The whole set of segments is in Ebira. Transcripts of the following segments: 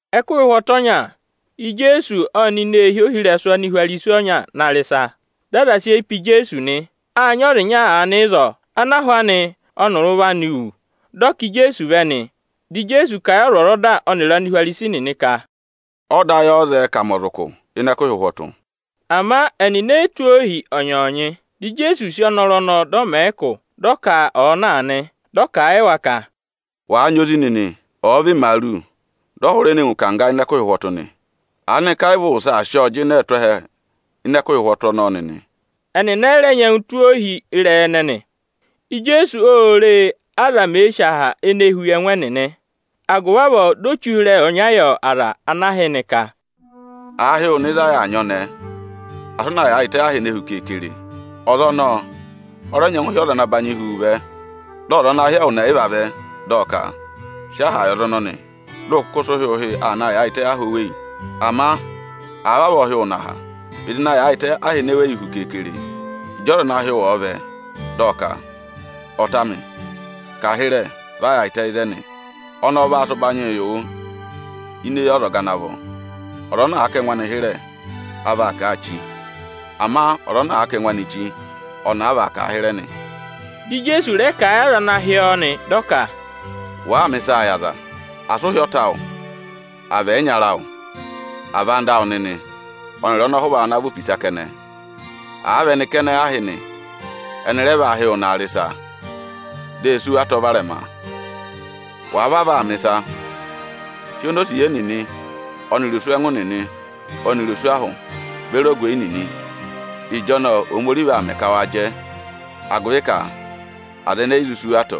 Ẹkụhị ụhwọtụ ọnya, Ijeesu ộ nọ ini eehi ohirẹsụ Anihwarisi ọnya na rị ịsa. Dị aza sị eyi pe Ijeesu nị. Â nyị ọza ịnya aanị ịzọọ ana ahụ anị ọnịrị ụvọ anị wụ̀; dị ọ ká Ijeesu vẹ nị. Dị Ijeesu kà a yị ọzwọzọda ọnịrị Anihwarisi nịnị ka, “Ọda ayị ọ́ọ́ zẹẹ ka à mẹ ọza ụkụ ịnị ẹkụhị ụhwọtụ?” Ama ẹnịnị e yi tụ́ ohi ọnyọọnyị. Dị Ijeesu sị ọnọrụ ọnọọ, dị ọ mẹ̀ ẹ ụkụ, dị ọ ka ọ̀ọ na nị Dị ọ kà a yị wa ka, “Wàa nyị ozi nịnị, ọ̀ọ vị imaaru, dị ọ hụrẹ ne ngụ ịkangga ịnị ẹkụhị ụhwọtụ nị, aanịka ẹ yị vị ụ wụsẹ aa sị ọọ jịnẹẹ tụ́ ẹhẹ ịnị ẹkụhị ụhwọtụ ọnọọ nịnị?” Ẹnịnị ẹ yị rẹ nyẹngụ tụ́ ọ ohi ịrẹyị ẹnẹnị. Ijeesu ô re, ázọga nịnị mèe sì aha ene huu yị ẹngụ ẹnịnị. Agụvị avọọ di o che ụhịrẹyị ọnya yị avaba ẹnịnị ka: “Àa hị́ wụ nọ ịzị a yà aa nyị ọnẹẹ, asị ụ na yaayịtẹ aha ene hu keekere! Ọza ọnọọ ọ rẹ nyẹngụ hị́ ọza ana nyị ụbanyị hu wu vẹ. Dị ọza ana hị́ ẹwụ nịnị ẹyịva vẹ, dị ọ ka: ‘Sị aha yị ọza ọnọnị!’ Dị ụ kụkụ sị ụhị-ụhị aa naa yaayịtẹ aha ene weyi hu keekere. Ama àa vavọọ hị́ wụ nọ aha, vịdị na yaayịtẹ aha ene weyi hu keekere! Ịjị ọza ana hị́ wụ ọ̀ọ vẹ, dị ọ ka: ‘Ọta amị, kà hịrẹ vẹ va yaayịtẹ ịzẹnị!’ Ọnọọ ọ vaa sị ụbanyịị yị wụ ini eyi ọzọga ana vọ nị. Ọza ana àa kà ẹngụ anị hịrẹ, a vaa kà a chí; ama ọza ana àa kà ẹngụ anị chí, ọnị a vaa kà a hịrẹ nị.” Di Ijeesu rẹ kà a yị aza ana dọ ọ ọzọga, dị ọ ka, “Wàaa mẹ̀ ịsaa yị aza, asị ụ hị́ ọta awụ, àa vị ẹyịnyara awụ, àa vị anda awụ nịnị ọnịrị ọnọhụva awụ ana vị opisa kẹnẹ! Àa vị ẹnị kẹnẹ, ụ hị́ nị, ẹnị rẹ vaa hị́ ẹwụ naa rị ịsa, di e sì wu atọ varẹma. Wàa vavọọ aa mẹ̀ ịsa, hị́ onosiye nịnị ọnịrị oswẹngụ nịnị ọnịrị oswahụ beri ogweyi nịnị. Ịjọnọọ Ohomorihi vaa mẹ ka waa jẹ, agụvị ka aza ẹnẹẹ e yi zụ sí wu atọ.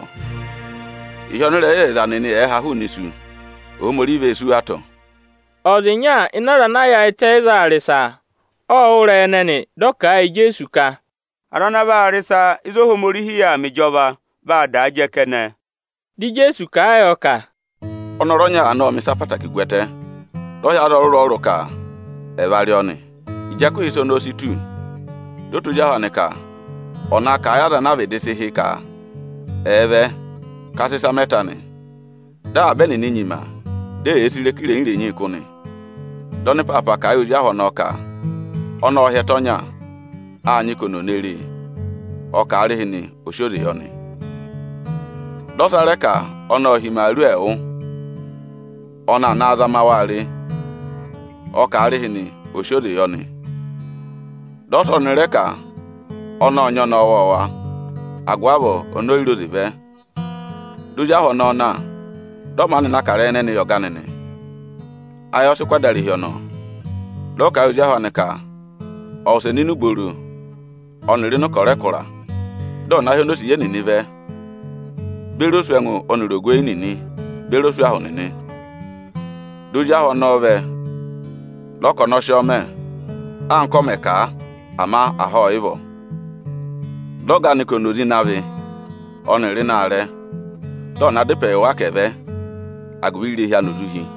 Ịhị ọnịrẹyịzẹyịza nịnị ẹ̀ẹ ha hụụnị isu, Ohomorihi vee sí wu atọ.” Ọza ịnya ịnị aza ana yaayịtẹ ịzọọ aa rị ịsa, ộ wụ́ ịrẹyị ẹnẹnị, dị ọ kà a yị Ijeesu ka, “Aza ana vaa rị ịsa ịzị Ohomorihi yà aa mẹ ịjọva, vaa daa jẹ kẹnẹ.” Dị Ijeesu kà a yọ ka, “Ọnọrụ ọnya aanị ộ mẹ̀ ịsa ọkụmị-ọkụmị gwẹtẹ, dị ọ hị́ aza ọrụrụ-ọrụrụ ka ẹ̀ va rị ọọ nị. Ịjị ụmẹ ana vọrọ ka à rị ịsa ọnọọ si tù, dị ọ tụ́ ozi ahụ anị ka ọ̀ na kà a yị aza ana a vịdị sị hị́ ka ẹ̀ vẹ ka a sị ịsa mẹ ta nị. Dị avaba ẹnịnị nyima, di eyee sì ịrẹka irenyi-renyii kụ́ nị. Dị ọnịpaapa kà a yị ozi ahụ ọnọọ ka ọnị ộ hị́ ẹtẹ ọnya, â nyị ka oni ò ne re e. Ọ kà aarịhịnị ọ̀ sị oze yị ọnị. Dị ọsa rẹ ka ọnị ộ hị́ imaaru ẹẹwụ, ọnị aa na zama waa re. Ọ kà aarịhịnị ọ̀ sị oze yị ọnị. Dị ọsa ọnị rẹ ka ọnị ộ nyị ọnẹẹ ọwọọwa, agụvị avọọ oni o yi re oze vẹ. Di ozi ahụ ọnọọ na, dị ọ maanị na kà ịrẹyị ẹnẹnị yị ọga anị nị. Ayị ọ sị kụ́ adarehi ọnọọ, dị ọ kà a yị ozi ahụ anị ka ọ̀ wụsẹ nọ ini ubooro ọnịrị ịnị ịkọrọ ẹkụra, dị ọ̀ na hị́ onosiye nịnị vẹ beri oswẹngụ ọnịrị ogweyi nịnị beri oswahụ nịnị nị. “Dị ozi ahụ ọnọọ vẹ, dị ọ ka ọnị ọ sị ọọ mẹ, anka ọ mẹ̀ kà a, ama aha ọ yị vọ nị. Dị ọga anị ka ọ̀ nọ oze ịnị avị ọnịrị ịnị aarẹ, dị ọ̀ na dá ịpẹ yị wa ka ẹ̀ vẹ, agụvị irehi anị ò zụ hi nị.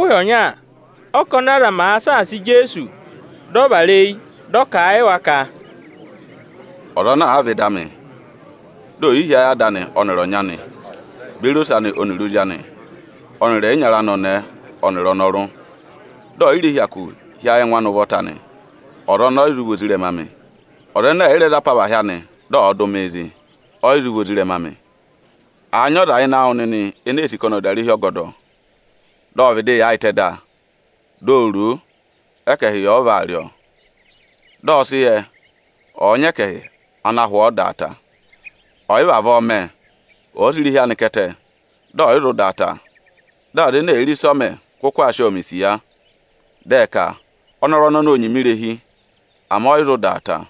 Ẹkụhị ọnya, ọ́kọnị aza màa saasa Ijeesu, dị ọ vara eyi, dị ọ kà a yị wa ka: “Ọza ana àa vẹ ịdị amị, di ò yi hí ayị ada anị ọnịrị ọnyị anị beri ose anị ọnịrị ozi anị ọnịrị ẹyịnyara anị ọnẹẹ ọnịrị ọnọrụ, dị ọ̀ yị rẹ hyakụ hí ayị ẹngụ anị ụvọta nị, ọza ọnọọ ọ yị zụ vị ozirẹma amị. Ọza ẹnẹ ẹ̀ yị rẹ za apavahị anị dị ọ̀ọ dụ mịị zị, ọ yị zụ vị ozirẹma amị. Àa nyị ọza ịnị awụ nịnị ene ee sì ka ọnị ọ̀ dà irehi ọgọdọ, vị ọ vịdị aa yaayịtẹ da, di o ro o, ẹkẹhị yà ọ vaa rị ọnị nị. Dị ọ sị yẹ, ọ̀ọ nyị ẹkẹhị ana hụ ọọ dà a ta. Ọ̀ yị vavọọ mẹ, ọ̀ọ sị irehi anị ká ẹtẹ, dị ọ yị zụ dà a ta. Dị aza ene èe re ịsị ọ mẹ kụkụ aa sị ọọ mẹ̀ isiya. Dị ẹ ka: ‘Ọnọrụ ọnọnị ô nyima irehi, ama ọ yị zụ dà a ta.’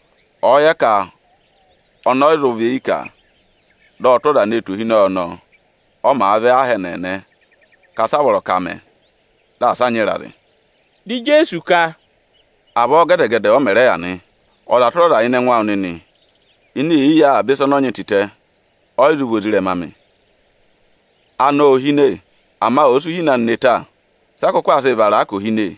Ọ̀ọ yẹ ka ọnị ọ yị zụ nọ ịrẹkụ anị, dị ọ tụ́ ọza ne tù ohinọyị ọnọọ, ọ màa vẹ aha ẹnẹẹnẹ ka sị a vọrọ ka à mẹ di asị a nyị ịrazị.” Dị Ijeesu ka, “Avọọ gẹdẹ-gẹdẹ ọ mẹ̀ rẹ yà nị; ọza tụra ọza ịnị ẹngụ awụ nịnị ene è yi yi avaba ịsa ọnị ọ nyị tịtẹ, ọ yị zụ vị ozirẹma amị.” “Anọ ô hine, ama ọ̀ọ sị uhine anị ne ta, sị a kụkụ zụ sị vara a ka ò hine?